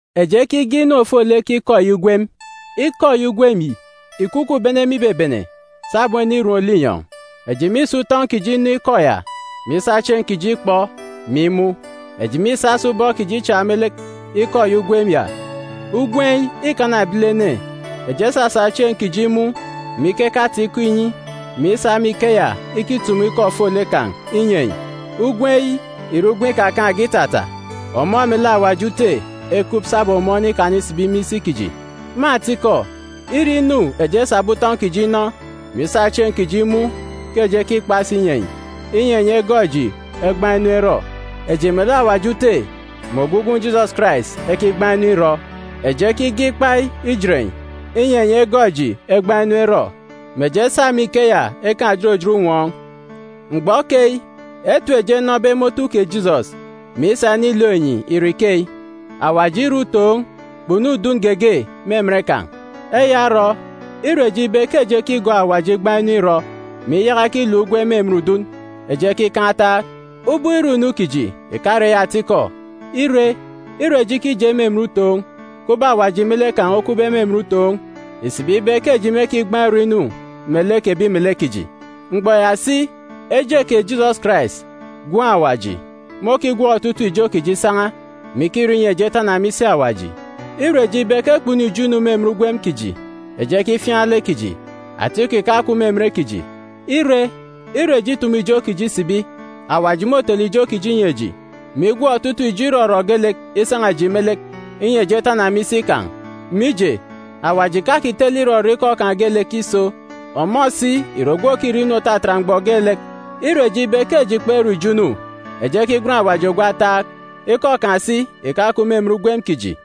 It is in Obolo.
Eji ekige inu ofolek Ikọ eyi Ugwem. Ikọ eyi Ugwem yi ìkukup bene me ibebene, sabum enirom linyọn̄. Eji mîsa utọn̄ kiji inọ Ikọ ya, mè isa chieen̄ kiji ikpọ, mè imun̄. Eji mîsa si ubọk kiji ichak me lek Ikọ eyi Ugwem ya. Ugwem yi îkana ebilene, eji esasa chieen̄ kiji imun̄, mè ikeke ata-ikọ inyi, mè isa me ikeya ikitumu ikọ ofolek kan̄ inyi enyi. Ugwem yi ìre ugwem ikakaan̄ge itata. Ọmọ melek Awaji Ute ekup sabum ọmọ onikana isibi me isi kiji. Me atikọ, îre inu eji esabe utọn̄ kiji inọ, mè isa chieen̄ kiji imun̄ ke eji ekikpa si inyi enyi, inyi enyi egọọk eji egbaan̄ inu erọ. Eji melek Awaji Ute mè ogwu Gwun̄ Jisọs Karais ekigbaan̄ inu irọ. Eji ekige ikpa yi ijet enyi, inyi enyi egọọk eji egbaan̄ inu erọ, mè eji esa me ikeya ekaan̄ òjot òjot unwọọn̄. Mgbọ keyi, etip eji enọbe me otu kè Jisọs, mè isa inilook enyi ìre ikeyi: Awaji ìre utoon̄, kpunu udun geege me emen kan̄. Eya orọ, ire eji ibe ke eji ekigọọk Awaji igbaan̄ inu irọ, mè iyaka ikiluk ugwem me emen udun, eji ekikan̄ ataak. Ubọk irọ inu kiji ìkare eyi atikọ. Ire, ire eji ikije me emen utoon̄, kubọk Awaji me lek kan̄ okupbe me emen utoon̄, ìsibi ibe ke eji mêkigbaan̄ irọ inu melek ebi melek kiji. Mgbọ ya si, eje kè Jisọs Karais, Gwun̄ Awaji, môkigwọk otutuuk ijo kiji isan̄a, mè ikirọ inyi eji etana me isi Awaji. Ire eji ibe ke kpunu ijo inu me emen ugwem kiji, eji ekifiaan̄ lek kiji. Atikọ ìkakup me emen kiji. Ire, ire eji itumu ijo kiji isibi, Awaji môtele ijo kiji inyi eji, mè igwọk otutuuk ijo irọrọ geelek isan̄a eji me lek, inyi eji etana me isi kan̄, mije, Awaji ìkakitele irọrọ ikọ kan̄ geelek iso. Ọmọ si ìre ogwu òkirọ inu òtatat mgbọ geelek. Ire eji ibe ke eji kperọ ijo inu, eji ekigwen Awaji ogwu ataak. Ikọ kan̄ si ìkakup me emen ugwem kiji.